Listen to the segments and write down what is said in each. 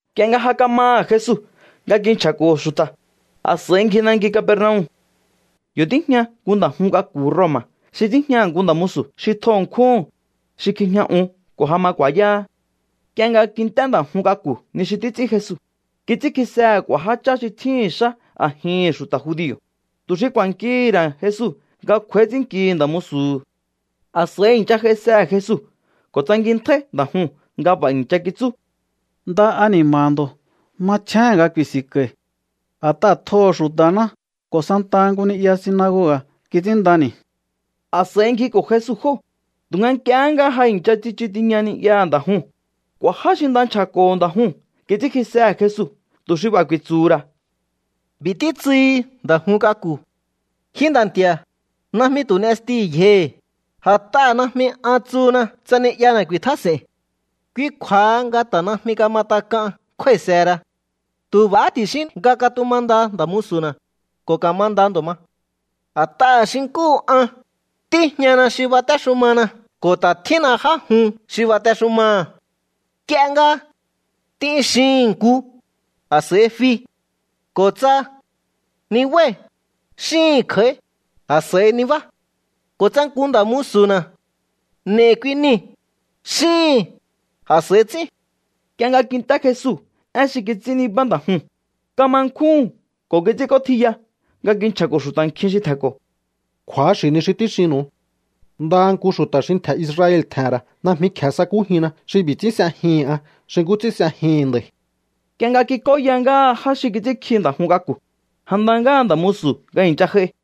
Nk'ie nga ja kamaha̱ Jesu nga kinchja̱ko̱ xu̱ta̱, a̱s'a̱i ngji nanki Capernaum. Yo̱ tíjña nku nda̱ jun k'aku̱ Roma̱ xi tíjñaha̱ nku nda̱ musu̱ xi tjo ṉkjúhu̱n, xi kjijña un ko̱ ja ma ku̱a̱yáhá. Nk'ie nga kint'é nda̱ jun k'aku̱ ni xi títs'ín Jesu, kits'ínkjisehe̱ k'u̱a̱ jáchá xi tjíhi̱n xá a̱jihi̱n xu̱ta̱ judio̱, tu̱ xi ku̱a̱nkihi̱ ra̱ Jesu nga kj'u̱a̱í ts'ínnkihi̱ nda̱ musu̱hu̱. A̱s'a̱i i̱ncha j'aisehe̱ Jesu ko̱ tsankintjáí nda̱ juu̱n nga b'a̱ i̱ncha kitsú: —Nda ani̱ma̱ha̱ ndo̱. Machjéhe̱n nga ku̱i̱si̱nko̱i̱. A̱t'aha̱ tjoho̱ xu̱ta̱ná ko̱ santaha nku ni'ya sinagoga̱ kits'ínndani̱. A̱s'a̱i ngjiko̱ Jesu jóo̱. Tu̱nga nk'iehé nga ja i̱ncha tsichu tiña ni'yaha̱ nda̱ juu̱n, k'u̱a̱ já xi nda nchja̱ko̱ho̱ nda̱ juu̱n kits'ínkjisehe̱ Jesu tu̱ xi b'a̱ ku̱i̱tsu̱hu̱ ra̱: —B'i̱ títsuhi nda̱ jun k'aku̱: Ji nda̱ nti̱a̱, najmi tu̱ n'estihi̱ yjohi̱, a̱t'aha̱ najmi an tsuhuna tsa ni'yana̱ ku̱i̱tjás'e̱i̱n. Kui kju̱a̱ha nga ta̱ najmi kama tak'an kjúái̱sehera. Tu̱ b'a̱ ti̱xín ní nga katumanda nda̱ musu̱na̱, ko̱ ka̱manda ndo̱ ma. A̱t'aha̱ xi nkúhu an, tíjñana xi batéxumana ko̱ ta̱ tjínna já jun xi batexumaha̱. Nk'ie nga: “T'in”, xihi̱n nku, a̱s'a̱i fi. Ko̱ tsa: “Nibái̱”, xíhi̱n kj'a̱í, a̱s'a̱i nibá. Ko̱ tsa nku nda̱ musu̱na̱: “N'e̱i̱ kui nii̱”, xíhi̱n, a̱s'a̱i ts'ín. Nk'ie nga kint'é Jesu én xi kits'ín nibá nda̱ juu̱n, kama nkjúhu̱n ko̱ kits'ínk'ótjiya nga kinchja̱ko̱ xu̱ta̱ nkjin xi tje̱nko̱: —Kju̱axi̱ ni xi tíxinnu̱u. Ndaha nku xu̱ta̱ xi ntje̱ Israel tje̱he̱n ra̱ najmi kje̱e sakújinna xi b'i̱ ts'ín s'ejihi̱n an xi nkú ts'ín s'ejihi̱n nda̱i̱. Nk'ie nga kik'óya ngáha já xi kits'ínkji nda̱ jun k'aku̱, ja nda ngáha nda̱ musu̱ nga i̱ncha j'ai.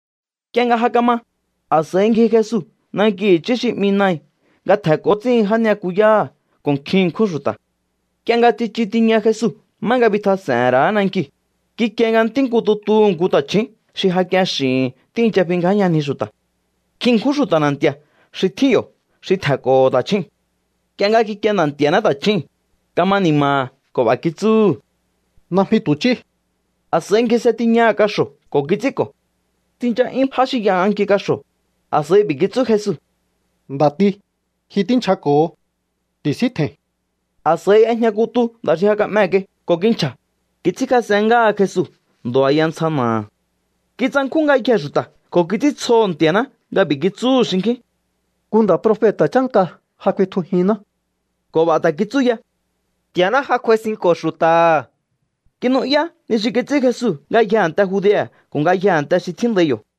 Nk'ie nga ja kama, a̱s'a̱i ngji Jesu nanki i̱chí xi 'mi Nain nga tje̱nko̱ ts'íhin já ni'yakuyáha̱ ko̱ nkjin ṉkjún xu̱ta̱. Nk'ie nga ja tsichu tiña Jesu má nga bitjas'e̱he̱n ra̱á nankiu̱, kikie nga ntí nku tutuhu̱ nku ta̱chju̱ún xi ja k'ien x'i̱hi̱n tíi̱ncha fingjáyanji xu̱ta̱. Nkjin ṉkjún xu̱ta̱ na̱nti̱a̱ xi tjín yo̱ xi tje̱nko̱ho̱ ta̱chjúu̱n. Nk'ie nga kikie Nda̱ Nti̱a̱ná ta̱chjúu̱n, kama ni̱ma̱ha̱ ko̱ b'a̱ kitsúhu̱: —Najmi tu̱ ch'í. A̱s'a̱i ngjise tiñaha̱ kaxo̱ ko̱ kits'ínko̱. Tsincha'yún já xi y'anganki kaxo̱. A̱s'a̱i b'i̱ kitsú Jesu: —Nda̱ti, ji tínchjako̱ho. ¡Ti̱síntje̱i̱n! A̱s'a̱i y'ejña kutu nda̱ xi ja ka'mee̱ kai ko̱ kinchja̱. Kits'ínkjas'en ngáha Jesu ndo̱ a̱ya ntsja na̱aha̱. Kitsankjún ngayjee̱ xu̱ta̱ ko̱ kits'íntsjoho̱ Nti̱a̱ná nga b'i̱ kitsúhu̱ xinkjín: —Nku nda̱ profeta̱ chánka ja kuitjujinná. Ko̱ b'a̱ ta̱ kitsú ya: —Nti̱a̱ná ja kj'uaisinko̱ xu̱ta̱ha̱. Kinu'yá ni xi kits'ín Jesu ngayjee̱ a̱nte Judea̱ ko̱ ngayjee̱ a̱nte xi tjíndai yo̱.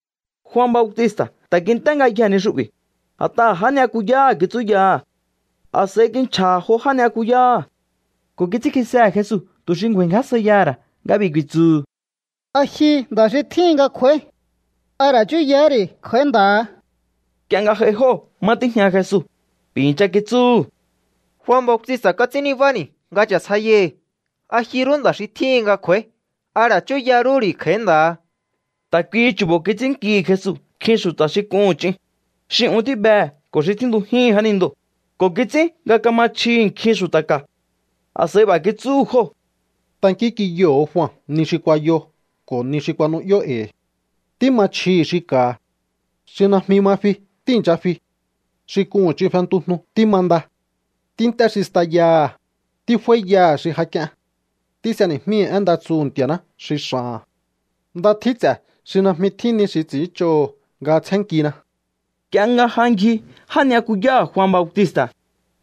Jua Bautista̱ ta̱ kint'é ngayjee̱ ni xu'bi̱, a̱t'aha̱ já ni'yakuyáha̱ kitsúyaha̱. A̱s'a̱i kinchja̱ha̱ jo já ni'yakuyáha̱ ko̱ kits'ínkjisehe̱ Jesu tu̱ xi ngju̱a̱i̱ngjásjaiyaha̱ ra̱ nga b'i̱ ku̱i̱tsu̱hu̱: “¿A ji nda̱ xi tjíhin nga kj'u̱a̱í? ¿A ra̱ chúyahá ri̱ kj'a̱í nda̱ha?” Nk'ie nga j'ai jóo̱ má tíjña Jesu, b'i̱ i̱ncha kitsúhu̱: —Jua Bautista̱ kuats'ín nibáni̱ nga cha̱sjaiyai̱hi̱: “¿A ji rú nda̱ xi tjíhin nga kj'u̱a̱í? ¿A ra̱ chúya rú ri̱ kj'a̱í nda̱ha?” Ta̱ kuihi chu̱bo̱ kits'ínnkihi̱ Jesu nkjin xu̱ta̱ xi k'uhu̱n ch'in, xi un tíbehe̱ ko̱ xi tjíntujíhi̱n jánindoo̱, ko̱ kits'ín nga kama chjihi̱ nkjin xu̱ta̱ ka̱. A̱s'a̱i b'a̱ kitsúhu̱ jóo̱: —Tankínk'inyoho̱o Jua ni xi kuayo ko̱ ni xi kuanu'yó e̱i̱. Tíma chjihi̱ xi ka̱ha̱. Xi najmi ma fi tíi̱ncha fi. Xi k'uhu̱n ch'in fentujnu tímanda. Tínt'é xi stayaha̱. Tíf'áíyaha̱ xi ja k'ien. Tís'eni̱jmíhi̱ én nda tsuhu̱ Nti̱a̱ná xi x'a̱ha̱n. ¡Nda tjín ts'e̱ xi najmi tjín ni xi ts'i̱ínch'oho̱ nga tsjénnkina! Nk'ie nga ja ngji já ni'yakuyáha̱ Jua Bautista̱,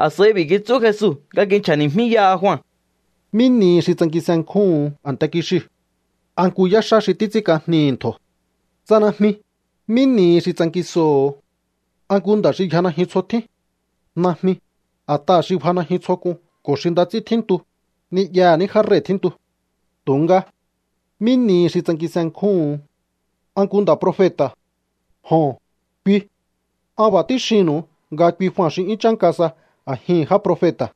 a̱s'a̱i b'i̱ kitsú Jesu nga kinchja̱ni̱jmíyaha Jua: —¿Mí nihi xi tsankinsenkjúhu̱un a̱nte kixiu̱? ¿A nku yáxá xi títs'ínk'ajnihi̱ ntjo̱? Tsa najmi, ¿mí nihi xi tsankinsoho̱o? ¿A nku nda̱ xi yja najyun tsjo tjín? Najmi, a̱t'aha̱ xi bja najyun tsjo k'un ko̱ xi nda ts'ín tjíntu, ni'yaha̱ ní já rei̱ tjíntu. Tu̱nga, ¿mí nihi xi tsankinsenkjúhu̱un? ¿A nku nda̱ profeta̱? Joho̱n, kui. An b'a̱ tíxinnu̱u nga kui Jua xi 'yún chánka sa a̱jihi̱n já profeta̱.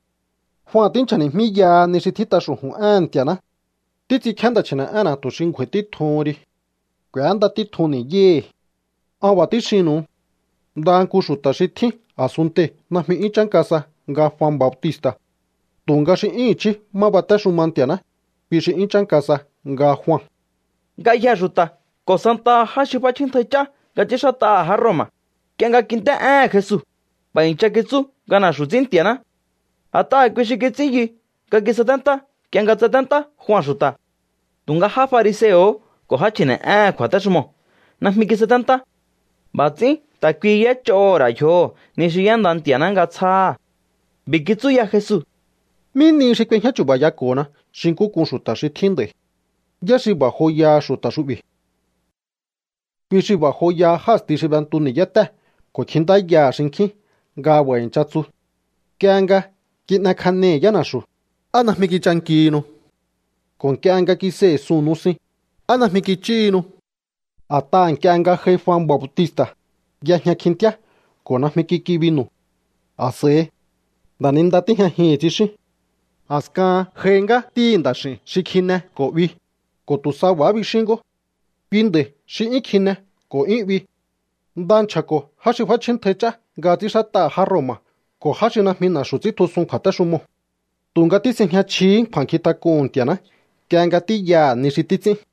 ’Jua tínchja̱ni̱jmíyaha ni xi tjít'a xu̱ju̱n éhe̱n Nti̱a̱ná: Títs'inkjíá nda̱ chji̱ne̱'énna̱ tu̱ xi ngju̱a̱i̱ títjuhun ri. K'u̱énda títjun ni̱yáhi̱. An b'a̱ tíxinnu̱u. Ndaha nku xu̱ta̱ xi tjín a̱sunntei̱ najmi 'yún chánka sa nga Jua Bautista̱. Tu̱nga xi 'yún i̱chí má batéxuma Nti̱a̱ná, kui xi 'yún chánka sa nga Jua. Ngayjee̱ xu̱ta̱ ko̱ santaha já xi f'áchjíntjai ch'á nga ts'ínxát'aha̱ já Roma̱, nk'ie nga kint'é éhe̱n Jesu, b'a̱ i̱ncha kitsú nga na̱xu̱ ts'ín Nti̱a̱ná. A̱t'aha̱ kui xi kits'ín yu nga kisaténtá nk'ie nga tsaténtá Jua xu̱ta̱. Tu̱nga já fariseo̱hó ko̱ já chji̱ne̱'éhe̱n kju̱a̱téxumoo̱ najmi kisaténtá. B'a̱ ts'ín ta̱ kuihi y'éch'oho̱ ra̱ yjoho̱ ni xi y'énda Nti̱a̱ná nga tsjáha̱. B'i̱ kitsú ya Jesu: —¿Mí nihi xi k'uejñá chu̱ba̱yako̱hona xi nkú k'un xu̱ta̱ xi tjín nd'a̱i̱? ¿Yá xi b'a̱ joyaha xu̱ta̱ xu'bi̱? Kui xi b'a̱ joyaha já a̱sti xi b'entu ni̱yátée̱ ko̱ kjintáyaha̱ xinkjín nga b'a̱ i̱ncha tsu: “Nk'ie nga kin'ekjanei̱ yána̱xu̱, ¿á najmi kichankihinu? Ko̱ nk'ie nga kisei̱ suu̱n nusin, ¿á najmi kich'íhinu?” ’A̱t'aha̱ nk'ie nga j'ai Jua Bautista̱, y'ejña kjintíá ko̱ najmi kik'i binu̱. A̱s'a̱i: “Nda̱ninda tíjñajihi̱n”, tsixíún. A̱skahan j'ai ngá Ntíhi̱ Nda̱x'i̱u̱n xi kjine ko̱ 'bi, ko̱ tu̱ sa b'a̱há bixín ngó: “Kui nda̱i̱ xi 'yún kjine ko̱ 'yún 'bi. Nda nchja̱ko̱ já xi f'áchjíntjai ch'á nga ts'ínxát'aha̱ já Roma̱ ko̱ já xi najmi na̱xu̱ ts'íntjusun kju̱a̱téxumoo̱.” Tu̱nga tís'ejña chjihí kju̱a̱nkjintak'uhu̱n Nti̱a̱ná nk'ie nga tíyaha̱ ni xi títs'ín.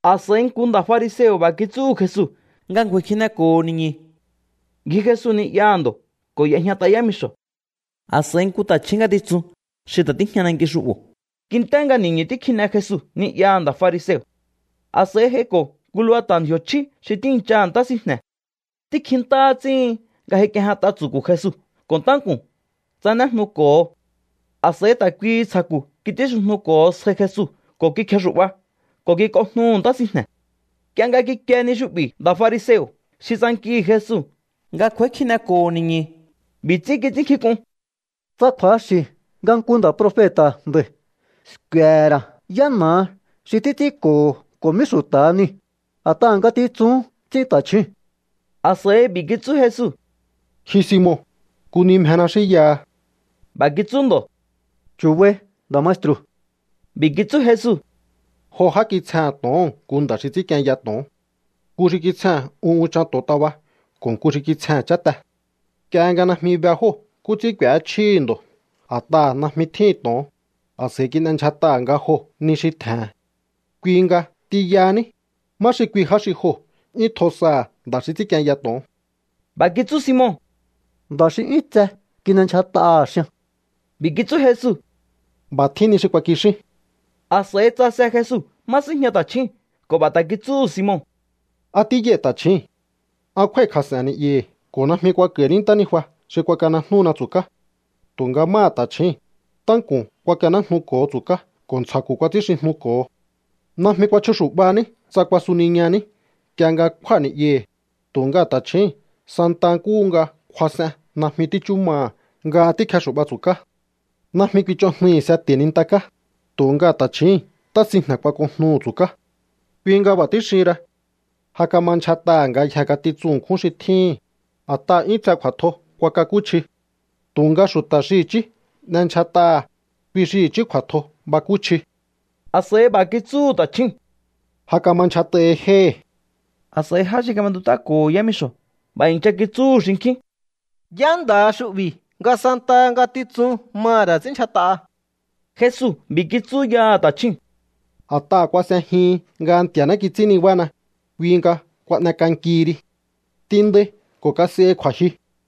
A̱s'a̱i nku nda̱ fariseo̱ b'a̱ kitsúhu̱ Jesu nga ngju̱a̱i̱ kjineko̱ho̱ ni̱ñu̱. Ngji Jesu ni'yaha̱ ndo̱ ko̱ y'ejñat'a yámixo̱. A̱s'a̱i nku ta̱chju̱ún ngatitsun xi ta̱ tíjña nanki xu'bo̱ kint'é nga ni̱ñu̱ tíkjine Jesu ni'yaha̱ nda̱ fariseo̱. A̱s'a̱i j'aiko̱ nku lubata̱ ndji̱o̱ chjí xi tíi̱nchaha̱ ntá sinjne̱. Tíkjintáhá ts'íhin nga j'aik'iejñat'a tsu̱ku̱ Jesu ko̱ ntánku̱n tsanéjnuko̱ho. A̱s'a̱i ta̱ kuihi ntsja̱ku̱ kits'ínxijnuko̱ho sjai Jesu ko̱ kikjexu̱'ba ko̱ kik'onjnuhu̱ ntá sinjne̱. Nk'ie nga kikie ni xu'bi̱ nda̱ fariseo̱ xi tsankihi̱ Jesu nga kj'u̱a̱í kjineko̱ho̱ ni̱ñu̱, b'i̱ ts'ín kits'ínnkjink'un: “Tsa kju̱axi̱ nga nku nda̱ profeta̱ nda̱i̱, sku̱e̱ ra̱ yá na̱aha xi títs'ínko̱ho̱ ko̱ mí xu̱ta̱ha niu̱, a̱t'aha̱ ngatitsuhún ts'ín ta̱chjúu̱n.” A̱s'a̱i b'i̱ kitsú Jesu: —Ji Simon, nku ni mjena xínyaha. B'a̱ kitsú ndo̱: —Chu̱bai, nda̱ maestru̱. B'i̱ kitsú Jesu: —Jo já kitsjehe̱n to̱oho̱n nku nda̱ xi ts'ínkienya to̱on. Nku xi kitsjehe̱n un unchan to̱ontaba ko̱ nku xi kitsjehe̱n cháte. Nk'ie nga najmi be jóo̱ nkú ts'ín k'u̱échjíhi̱ ndo̱ a̱t'aha̱ najmi tjíhi̱n to̱on, a̱s'a̱i kin'endyjat'aha̱ nga joo̱ ni xi tje̱he̱n. Kui nga t'inyahaní, ¿má xi kui já xi joo̱ 'yún tjo saha̱ nda̱ xi ts'ínkienya to̱on? B'a̱ kitsú Simon: —Nda̱ xi 'yún tse kin'endyjat'aha̱, xian. B'i̱ kitsú Jesu: —B'a̱ tjín ni xi kuakixín. A̱s'a̱i tsase Jesu má síjña ta̱chjúu̱n ko̱ b'a̱ ta̱ kitsúhu̱ Simon: —¿A tíyai ta̱chjíi̱n? An kjúái̱kjas'e̱n ni'yahi̱ ko̱ najmi kuak'a̱i̱ní ntánijua xi kuanejnúhuna tsu̱ká. Tu̱nga máha ta̱chjíi̱n, ntánku̱n kuakanéjnuko̱ho tsu̱ká ko̱ ntsja̱ku̱ kuats'ínxijnuko̱ho. Najmi kuachjuxu̱'baní tsa kuasuniñaní nk'ie nga kjúa̱ ni'yahi̱, tu̱nga ta̱chjíi̱n santa nkúhu nga kuas'en najmi tíchú maha̱ nga tíkjexu̱'ba tsu̱ká. Najmi kuich'onjnuihi̱ seti̱ nintaká, tu̱nga ta̱chjíi̱n ntá sinjne̱ kuak'onjnuhu̱ tsu̱ká. Kui nga b'a̱ tíxihin ra. Ja kama ndyjat'aha̱ ngayjee̱ ngatitsun ṉkjún xi tjíhi̱n, a̱t'aha̱ 'yún tse kju̱a̱tjo kuakakúchji. Tu̱nga xu̱ta̱ xi i̱chí n'endyjat'aha̱, kui xi i̱chí kju̱a̱tjo bakúchji. A̱s'a̱i b'a̱ kitsúhu̱ ta̱chjúu̱n: —Ja kama ndyjat'ahi jéhi̱. A̱s'a̱i já xi kab'entut'áko̱ho̱ yámixo̱ b'a̱ i̱ncha kitsúhu̱ xinkjín: —¿Yá nda̱ha xu'bi̱ nga santaha ngatitsun maha̱ ra̱ ts'ínndyjat'aha? Jesu b'i̱ kitsú yaha̱ ta̱chjúu̱n: —A̱t'aha̱ kuas'ejihin nga Nti̱a̱ná kits'ín nibána, kui nga kuan'ek'ankihi ri. T'inndai ko̱ kas'ehi kju̱a̱jyu.